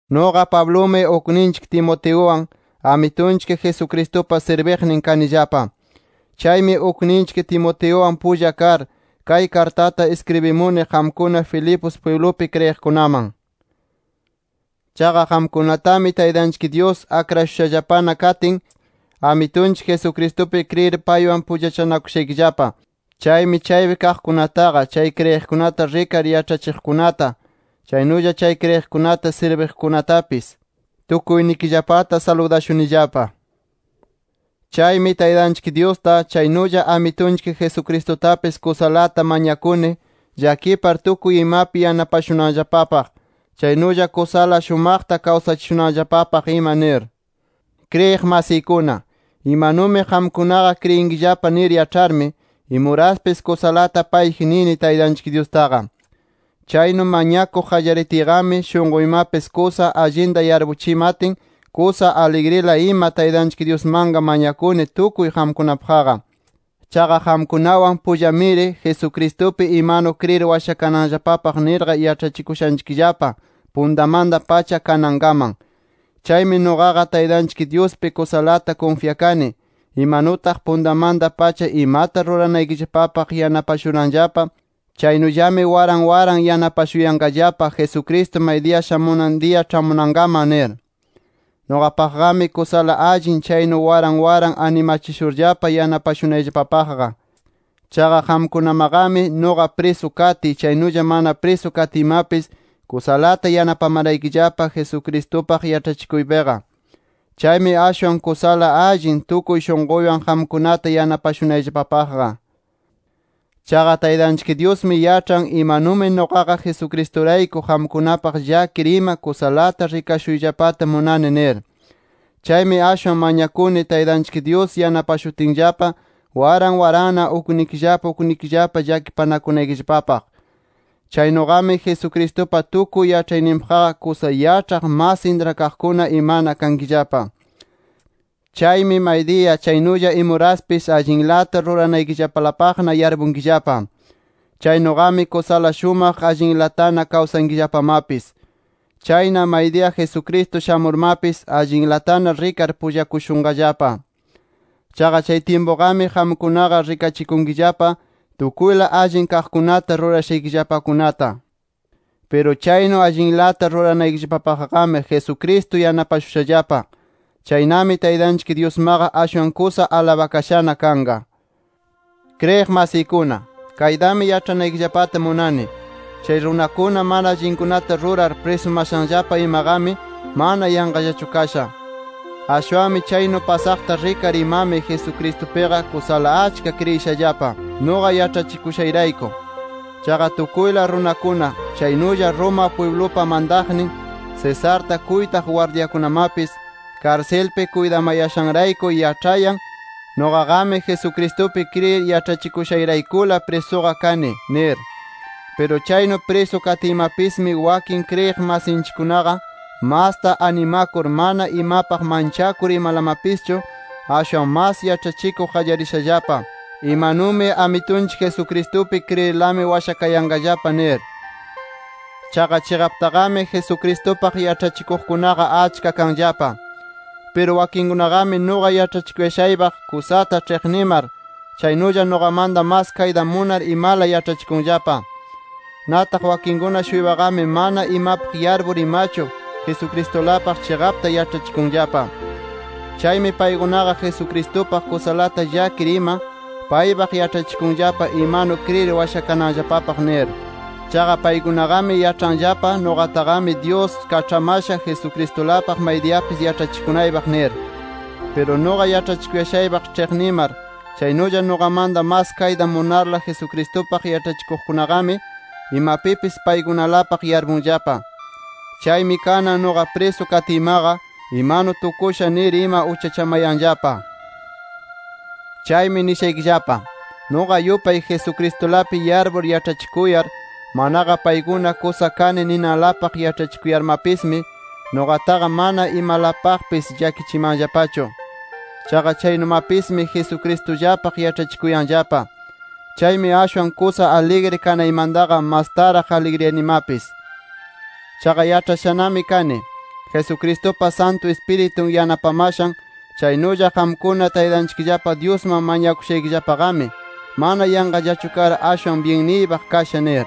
Nuqa Pablumi ukninchik Timoteuwan, Amitunchik Jesucristupa sirbiqnin kanillapa. Chaymi ukninchik Timoteuwan pulla kar, kay kartata iskribimuni qamkuna Filipos pwiblupi kriyiqkunaman. Chaqa qamkunatami Taytanchik Dyus akrashushallapana katin, Amitunchik Jesucristupi kriyir paywan pullachanakushaykillapa. Chaymi chaypi kaqkunataqa, chay kriyiqkunata rikar yaĉhachiqkunata, chaynulla chay kriyiqkunata sirbiqkunatapis tukuynikillapata saludashunillapa. Chaymi Taytanchik Dyusta, chaynulla Amitunchik Jesucristutapis kusalata mañakuni llakipar tukuy imapi yanapashunanllapapaq, chaynulla kusala shumaqta kawsachishunanllapapaq ima nir. Kriyiq masiykuna, imanumi qamkunaqa kriyinkillapa nir yaĉharmi, imuraspis kusalata payji nini Taytanchik Dyustaqa. Chaynu mañakuq qallaritiyqami, shunquymapis kusa allinta yarpuchimatin, kusa aligrila ima Taytanchik Dyusmanqa mañakuni tukuy qamkunapaqqa. Chaqa qamkunawan pullamiri, Jesucristupi imanu kriyir washakananllapapaq nirqa yaĉhachikushanchikllapa, puntamanta-pacha kanankaman. Chaymi nuqaqa Taytanchik Dyuspi kusalata kunfyakani imanutaq puntamanta-pacha imata ruranaykillapapaq yanapashuranllapa, chaynullami waran waran yanapashuyanqallapa, Jesucristo maydiya shamunan diya ĉhamunankaman nir. Nuqapaqqami, kusala allin chaynu waran waran animachishurllapa yanapashunayllapapaqqa. Chaqa qamkunamaqami, nuqa prisu katiy, chaynulla mana prisu katiymapis kusalata yanapamaraykillapa, Jesucristupaq yaĉhachikuypiqa. Chaymi ashwan kusala allin tukuy shunquywan qamkunata yanapashunayllapapaqqa. Chaqa Taytanchik Dyusmi yaĉhan, imanumi nuqaqa Jesucristurayku qamkunapaq llakir ima kusalata rikashuyllapata munani nir. Chaymi ashwan mañakuni Taytanchik Dyus yanapashutinllapa, waran waranna uknikillapa uknikillapa llakipanakunaykillapapaq. Chaynuqami Jesucristupa tukuy yaĉhayninpaqqa kusa yaĉhaq, mas intrakaqkuna imana kankillapa. Chaymi maydiya, chaynulla imuraspis, allinlata ruranaykillapalapaqna yarpunkillapa. Chaynuqami kusala shumaq allinlatana kawsankillapamapis. Chayna maydiya Jesucristo shamurmapis, allinlatana rikar pullakushunqallapa. Chaqa chay tyimpuqami qamkunaqa rikachikunkillapa, tukuyla allin kaqkunata rurashaykillapakunata. Piru chaynu allinlata ruranaykillapapaqmi, Jesucristo yanapashushallapa. Chaynami Taytanchik Dyusmaqa ashwan kusa alabakashana kanqa. Kriyiq masiykuna, kaytami yaĉhanaykillapata munani: Chay runakuna mana allinkunata rurar, prisumashanllapa imaqami mana yanqallachu kasha. Ashwanmi chaynu pasaqta rikar imami Jesucristupiqa kusala achka kriyishallapa, nuqa yaĉhachikushayrayku. Chaqa tukuyla runakuna, chaynulla Roma pwiblupa mantaqnin Cesarta kuytaq gwardyakunamapis, karsilpi kuytamayashanrayku yaĉhayan nuqaqami Jesucristupi kriyir yaĉhachikushayraykula prisuqa kani nir. Piru chaynu prisu katiymapismi, wakin kriyiq masinchikkunaqa, masta animakur mana imapaq manchakur imalamapischu ashwan mas yaĉhachikuq qallarishallapa, imanumi Amitunchik Jesucristupi kriyirlami washakayanqallapa nir. Chaqa chiqaptaqami Jesucristupaq yaĉhachikuqkunaqa achka kanllapa. Piru wakinkunaqami nuqa yaĉhachikuyashaypaq kusata ĉhiqnimar, chaynulla nuqamanta mas kayta munar imala yaĉhachikunllapa. Nataq wakinkuna-shuypaqami mana imapaq yarpur imachu Jesucristulapaq chiqapta yaĉhachikunllapa. Chaymi paykunaqa Jesucristupaq kusalata llakir ima, paypaq yaĉhachikunllapa imanu kriyir washakananllapapaq nir. Chaqa paykunaqami yaĉhanllapa, nuqataqami Dyus kaĉhamasha, Jesucristulapaq maydiyapis yaĉhachikunaypaq nir. Piru nuqa yaĉhachikuyashaypaq ĉhiqnimar, chaynulla nuqamanta mas kayta munarla Jesucristupaq yaĉhachikuqkunaqami, imapipis paykunalapaq yarpunllapa. Chaymi kanan nuqa prisu katiymaqa, imanu tukusha nir ima uchachamanayanllapa. Chaymi nishaykillapa: Nuqa yupay Jesucristulapi yarpur yaĉhachikuyar, manaqa paykuna kusa kani ninanlapaq yaĉhachikuyarmapismi, nuqataqa mana imalapaqpis llakichimanllapachu. Chaqa chaynumapismi Jesucristullapaq yaĉhachikuyanllapa. Chaymi ashwan kusa aligri kanaymantaqa, mastaraq aligriyanimapis. Chaqa yaĉhashanami kani, Jesucristupa Santu Ispiritun yanapamashan, chaynulla qamkuna Taytanchikllapa Dyusman mañakushaykillapaqami, mana yanqallachu kar, ashwan byinniypaq kasha nir.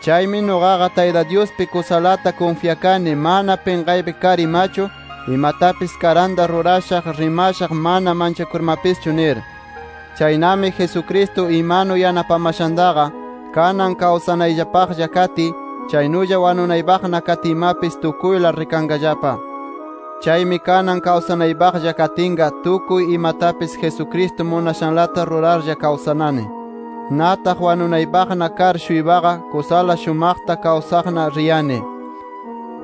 Chaymi nuqaqa Tayta Dyuspi kusalata kunfyakani mana pinqaypi kar imachu imatapis karanta rurashaq, rimashaq mana manchakurmapischu nir. Chaynami Jesucristo imanu yanapamashantaqa, kanan kawsanaypaqlla katiy, chaynulla wanunaypaqna katiymapis, tukuyla rikanqallapa. Chaymi kanan kawsanaypaqlla katinqa tukuy imatapis Jesucristo munashanlata rurarlla kawsanani. Nataq wanunaypaqna kar-shuypaqa kusala shumaqta kawsaqna riyani.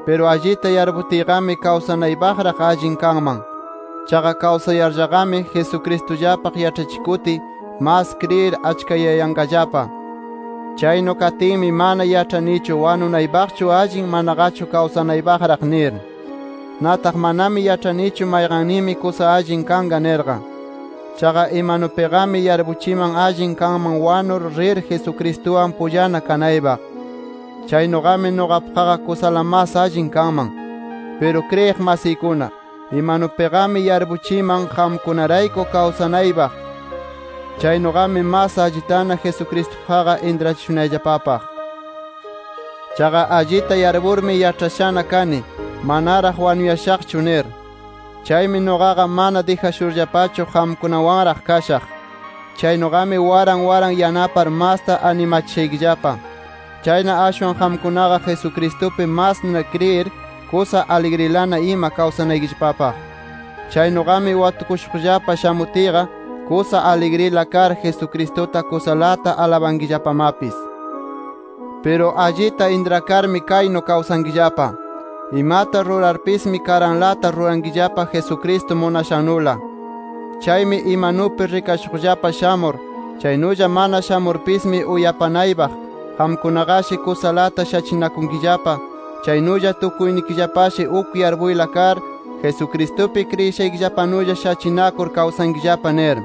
Piru allita yarputiyqami, kawsanaypaqraq allinqa kanman. Chaqa kawsayarllaqami, Jesucristullapaq yaĉhachikutiy mas kriyir achkayayanqallapa. Chaynu katinmi, mana yaĉhanichu wanunaypaqchu allin, manaqachu kawsanaypaqraq nir. Nataq manami yaĉhanichu mayqanninmi kusa allin kanqa nirqa. Chaqa imanupiqami yarpuchiman allin kanman wanur rir Jesucristuwan pullana kanaypaq. Chaynuqami nuqapaqqa kusala mas allin kanman. Piru kriyiq masiykuna, imanupiqami yarpuchiman qamkunarayku kawsanaypaq; chaynuqami mas allitana Jesucristupaqqa intrachishunayllapapaq. Chaqa allita yarpurmi yaĉhashana kani, manaraq wanuyashaqchu nir. Chaymi nuqaqa mana dijashurllapachu qamkunawanraq kashaq. Chaynuqami waran waran yanapar masta animachishaykillapa. Chayna ashwan qamkunaqa Jesucristupi masna kriyir, kusa aligrilana ima kawsanaykillapapaq. Chaynuqami watukushuqllapa shamutiyqa, kusa aligrila kar Jesucristuta kusalata alabankillapamapis. Piru allita intrakarmi kaynu kawsankillapa: Imata rurarpismi karanlata rurankillapa Jesucristo munashannula. Chaymi imanupi rikashuqllapa shamur, chaynulla mana shamurpismi uyapanaypaq, qamkunaqashi kusalata shachinakunkillapa, chaynulla tukuynikillapashi uk yarpuyla kar, Jesucristupi kriyishaykillapanulla shachinakur kawsankillapa nir.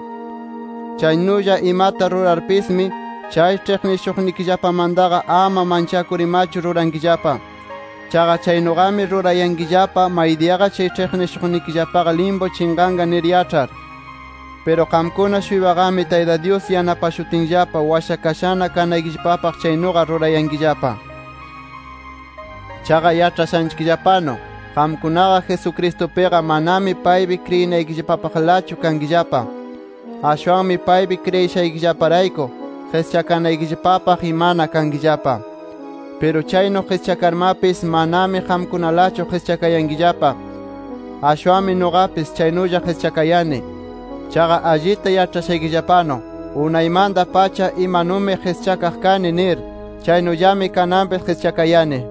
Chaynulla imata rurarpismi chay ĉhiqnishuqnikillapamantaqa ama manchakur imachu rurankillapa. Chaqa chaynuqami rurayankillapa maydiyaqa chay ĉhiqnishuqnikillapaqa limpu chinqanqa nir yaĉhar. Piru qamkuna-shuypaqami Tayta Dyus yanapashutinllapa, washakashana kanaykillapapaq chaynuqa rurayankillapa. Chaqa yaĉhashanchikllapanu qamkunaqa Jesucristupiqa, manami paypi kriyinaykillapapaqlachu kankillapa. Ashwanmi paypi kriyishaykillaparayku qischakanaykillapapaq imana kankillapa. Piru chaynu qischakarmapis manami qamkunalachu qischakayankillapa. Ashwanmi nuqapis chaynulla qischakayani. Chaqa allita yaĉhashaykillapanu unaymanta-pacha imanumi qischakaq kani nir, chaynullami kananpis qischakayani.